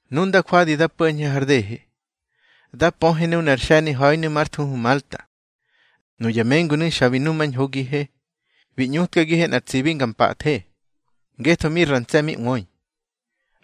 Nu nda jwadi da po̱ñhe har dehe, da pöhe nunar xe̱niha̱inu̱ már thuhu Malta. Nuya mengunu̱ xa bi numañhogihe. Bi ꞌñutkagihe nꞌar tsibi nga mpathe, ngetho mi ra ntse̱ mi ꞌwöi.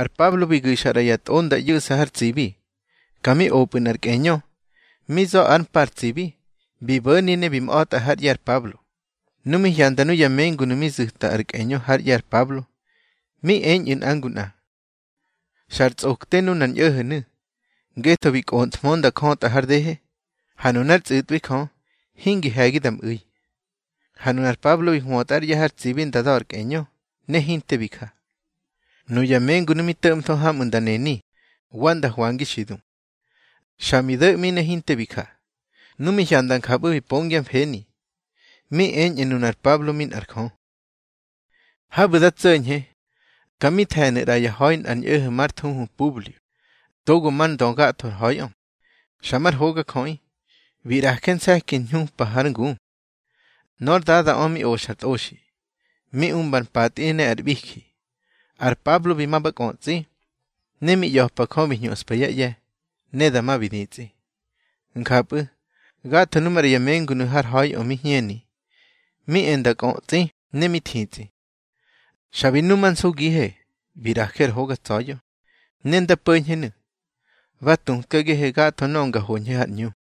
Ar Pablo bi gu̱xa ꞌra ya tꞌo nda ꞌyu̱ꞌsa har tsibi. Ka mi opꞌu̱ nꞌar kꞌeñö, mi za̱ ár mpa ar tsibi, bi bo̱ni ne bi mꞌa̱tꞌa hár ꞌye̱ ar Pablo. Nu mi hyanda nuya mengunu̱ mi zu̱ta ar kꞌeñö hár ꞌye̱ ar Pablo, mi eñꞌu̱ nꞌa ngu nꞌa: —Xar tsꞌokte nunar ñꞌo̱ho̱nu̱, ngetho bi kꞌonthmö nda jötꞌa har dehe, ha nunár tsꞌu̱tꞌwi Jö hingi he̱gi da mꞌu̱i. Ha nunar Pablo bi hwötꞌa ár ꞌye̱ har tsibi nda da̱ ar kꞌeñö, ne hinte bi ja. Nuya mengunu̱ mi to̱ꞌmtho hamꞌu̱ nda neni, wa nda hwangi xi du. Xa bi do̱ꞌmi ne hinte bi ja. Nu mi hyanda njapꞌu̱ bi pongyá mfeni, mi eñꞌu̱ nunar Pablo mi nꞌar jö. Habu̱ da tso̱ñhe, ka mi the̱nu̱ ꞌra yá ha̱i nꞌar ñꞌo̱ho̱ már thuhu Publio, togo mar ndö gatho ar ha̱iꞌö. Xa mar hogajöꞌi, bi ꞌraje nse̱ki hñupa hár ngu. Nór dadaꞌö mi oxar tꞌoxi, mi umbar mpatꞌi ne ar ꞌbiji. Ar Pablo bi ma ba kꞌötsꞌi, ne mi ꞌya̱pa Jö bi hñuxpa yá ꞌye̱, ne dama bi ditsꞌi. Njapꞌu̱, gatho nuꞌu̱ maꞌra ya mengunu̱ har ha̱iꞌö mi hñeni, mi e nda kꞌötsꞌi ne mi thitsꞌi. Xa bi numansugihe, bi ꞌraje nꞌar hoga tsa̱ya̱. Ne nda po̱ñhenu̱, bá tutkagihe gatho nöꞌö nga hoñhe har ꞌñu.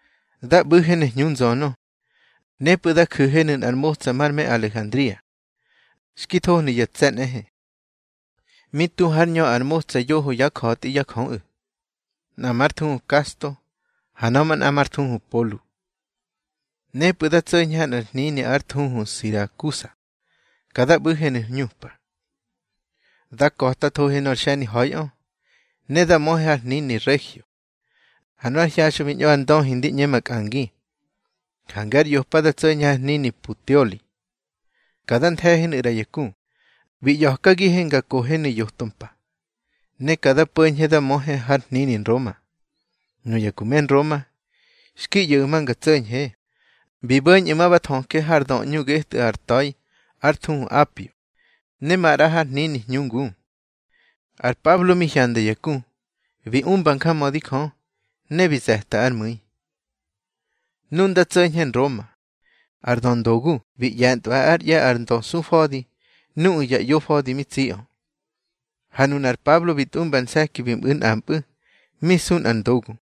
Da ꞌbu̱henu̱ hñu nzönö. Nepꞌu̱ da ju̱henu̱ nꞌar motsa mar me Alejandria, xki thohnu̱ ya tse̱ nꞌehe. Mi tu hár ñö ar motsa yoho yá ja̱tꞌi yá jöꞌu̱, nꞌa már thuhu Kasto, ha nöꞌö manꞌa már thuhu Polu. Nepꞌu̱ da tso̱ñhe ha nꞌar hnini ár thuhu Sirakusa, ka da ꞌbu̱henu̱ hñupa. Da ka̱tathohe nor xe̱niha̱iꞌö, ne da möhe har hnini Regio. Ha nu ár hyaxꞌö bi ñꞌo ar ndöhi ndi ꞌñe makꞌangi, jange ár yopa da tso̱ñhe har hnini Puteoli. Ka da nthe̱henu̱ ꞌra ya ku, bi ꞌya̱kagihe nga kohenu̱ yoto mpa. Ne ka da po̱ñhe da möhe har hnini Nroma. Nuya ku me Nroma, xki ꞌyo̱ꞌu̱ ma nga tso̱ñhe, bi bo̱ñꞌu̱ ma ba thöje har döꞌñu getꞌu̱ ar ta̱i ár thuhu Apio, ne maꞌra har hnini Hñu Ngu. Ar Pablo mi hyanda ya ku, bi umba njamödi Jö, ne bi ze̱ta ár mu̱i. Nu nda tso̱ñhe Nroma, ar döndogu bi ꞌye̱ntꞌwa ár ꞌye̱ ar ndösufa̱di nuꞌu̱ ya ꞌyofa̱di mi tsiꞌö. Ha nunar Pablo bi tꞌumba nse̱ki bi mꞌu̱ nꞌampꞌu̱, mi su nꞌar ndogu.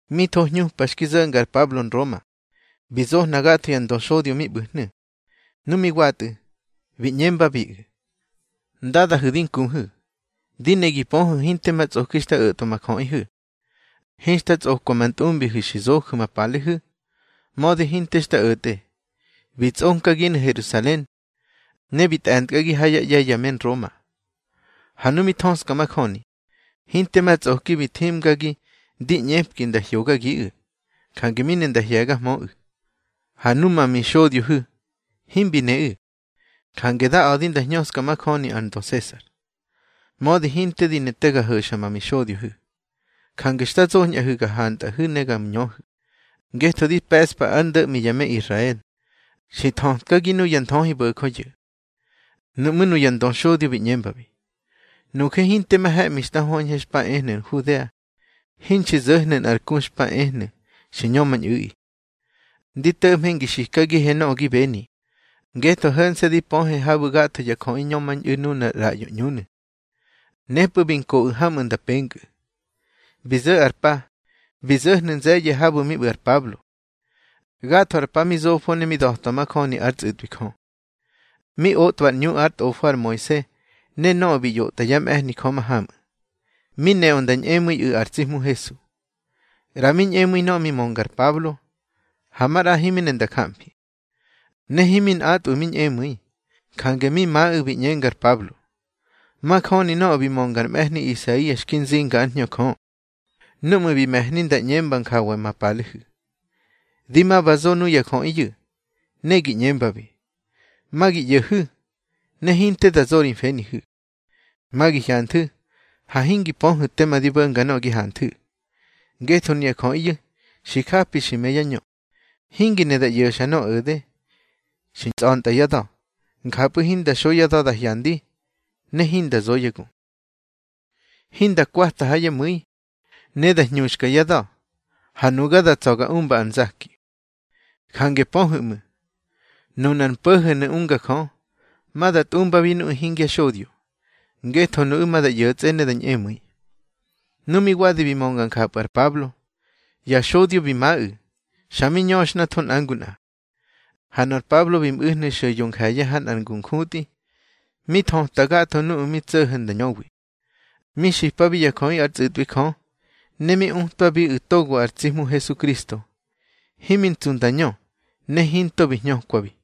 Mi tho hñupa xki zo̱nga ar Pablo Nroma, bi zohna gatho ya ndöxodyo mi ꞌbu̱hnu̱. Nu mi watꞌu̱, bi ꞌñembabiꞌu̱: —Ndadahu̱ di nkuhu̱, di ne gi pöhu̱ hinte ma tsꞌoki xta o̱tꞌwa ma jöꞌihu̱, hinxta tsꞌokwa ma ntꞌumbihu̱ xi zoju̱ ma palehu̱. Mödi hinte xta o̱tꞌe, bi tsꞌonkaginu̱ Herusalen, ne bi tꞌe̱ntkꞌagi ha yá ꞌye̱ ya me Nroma. Ha nu mi thöꞌska majöni, hinte ma tsꞌoki bi thimgagi ndi ꞌñepki nda hyogagiꞌu̱, jange mi ne nda hye̱gahmöꞌu̱. Ha numa mixodyohu̱, himbi neꞌu̱, jange da a̱di nda hñöska majöni ar ndö Sesar. Mödi hinte di ne te ga ho̱xa ma mixodyohu̱. Jange xta zoñꞌahu̱ ga hantꞌahu̱ ne ga ñöhu̱. Ngetho di pe̱ꞌspa ár ndo̱ꞌmi ya me Israel, xi nthötkagi nuya nthöhibo̱jöyu̱. Nuꞌmú̱ nuya ndö xodyo bi ꞌñembabi: —Nuje hinte ma he̱ꞌmi xta höñhe xpa ehnu̱ Nhudea, hinxi zo̱hnu̱ nꞌar ku xpa ehnu̱ xi ñömañꞌu̱ꞌi. Ndi to̱ꞌmhe ngi xikagihe nöꞌö gi beni, ngetho ho̱nse̱ di pöhe habu̱ gatho ya jöꞌi ñömañꞌu̱ nuna ar ꞌraꞌyo ꞌñunu̱. Nepꞌu̱ bi nkoꞌu̱ hamꞌu̱ nda penkꞌu̱. Bi zo̱ ar pa, bi zo̱hnu̱ nze̱ye̱ habu̱ mi ꞌbu̱ ar Pablo. Gatho ar pa mi zofo ne mi da̱twa majöni ár tsꞌu̱tꞌwi Jö. Mi otꞌwa ar ꞌñu ár tꞌofo ar Moise ne nöꞌö bi ꞌyotꞌa yá mꞌe̱hni Jö mahamꞌu̱, mi neꞌö nda ñꞌemu̱iꞌu̱ ar tsi Hmu Hesu. ꞌRa mi ñꞌemu̱i nöꞌö mi mönga ar Pablo, ha maꞌra himi ne nda jamfi. Ne himi nꞌatꞌwu̱ mi ñꞌemu̱i, jange mi maꞌu̱ bi ꞌñenga ar Pablo: —Majöni nöꞌö bi mönga ar mꞌe̱hni Isaia xki nzinga ár Hñö Jö, núꞌmu̱ bi me̱hni nda ꞌñemba njawa ma palehu̱: Di ma ba zo nuya jöꞌiyu̱, ne gi ꞌñembabi: Ma gi ꞌyo̱hu̱, ne hinte da zo ri mfenihu̱. Ma gi hyanthu̱, ha hingi pöhu̱ tema di bo̱nga nöꞌö gi hanthu̱. Ngetho nuya jöꞌiyu̱ xi japi xi më yá ñö, hingi ne da ꞌyo̱xa nöꞌö o̱de. Xi tsꞌa̱ntꞌa yá da̱, njapꞌu̱ hinda xo yá da̱ da hyandi, ne hinda zo yá gu, hinda kwata ha yá mu̱i, ne da hñuxka yá da̱, ha nuga da tsa̱ ga umba ár nzaki. Jange pöhu̱ ꞌmu̱, nuna ar mpo̱ho̱nu̱ unga Jö, ma da tꞌumbabi nuꞌu̱ hingya xodyo, ngetho nuꞌu̱ ma da ꞌyo̱tsꞌe ne da ñꞌemu̱i. Nu mi wadi bi mönga njapꞌu̱ ar Pablo, ya xodyo bi maꞌu̱, xa mi ñöxhnatho nꞌa ngu nꞌa. Ha nor Pablo bi mꞌu̱hnu̱ xo̱ yo nje̱ye̱ ha nꞌar ngu njutꞌi, ne mi thöta gatho nuꞌu̱ mi tso̱ho̱ nda ñöwi. Mi xipabi ya jöꞌi ár tsꞌu̱tꞌwi Jö, ne mi utwabiꞌu̱ togo ar tsi Hmu Hesukristo. Himi ntsu nda ñö, ne hinto bi hñökwabi.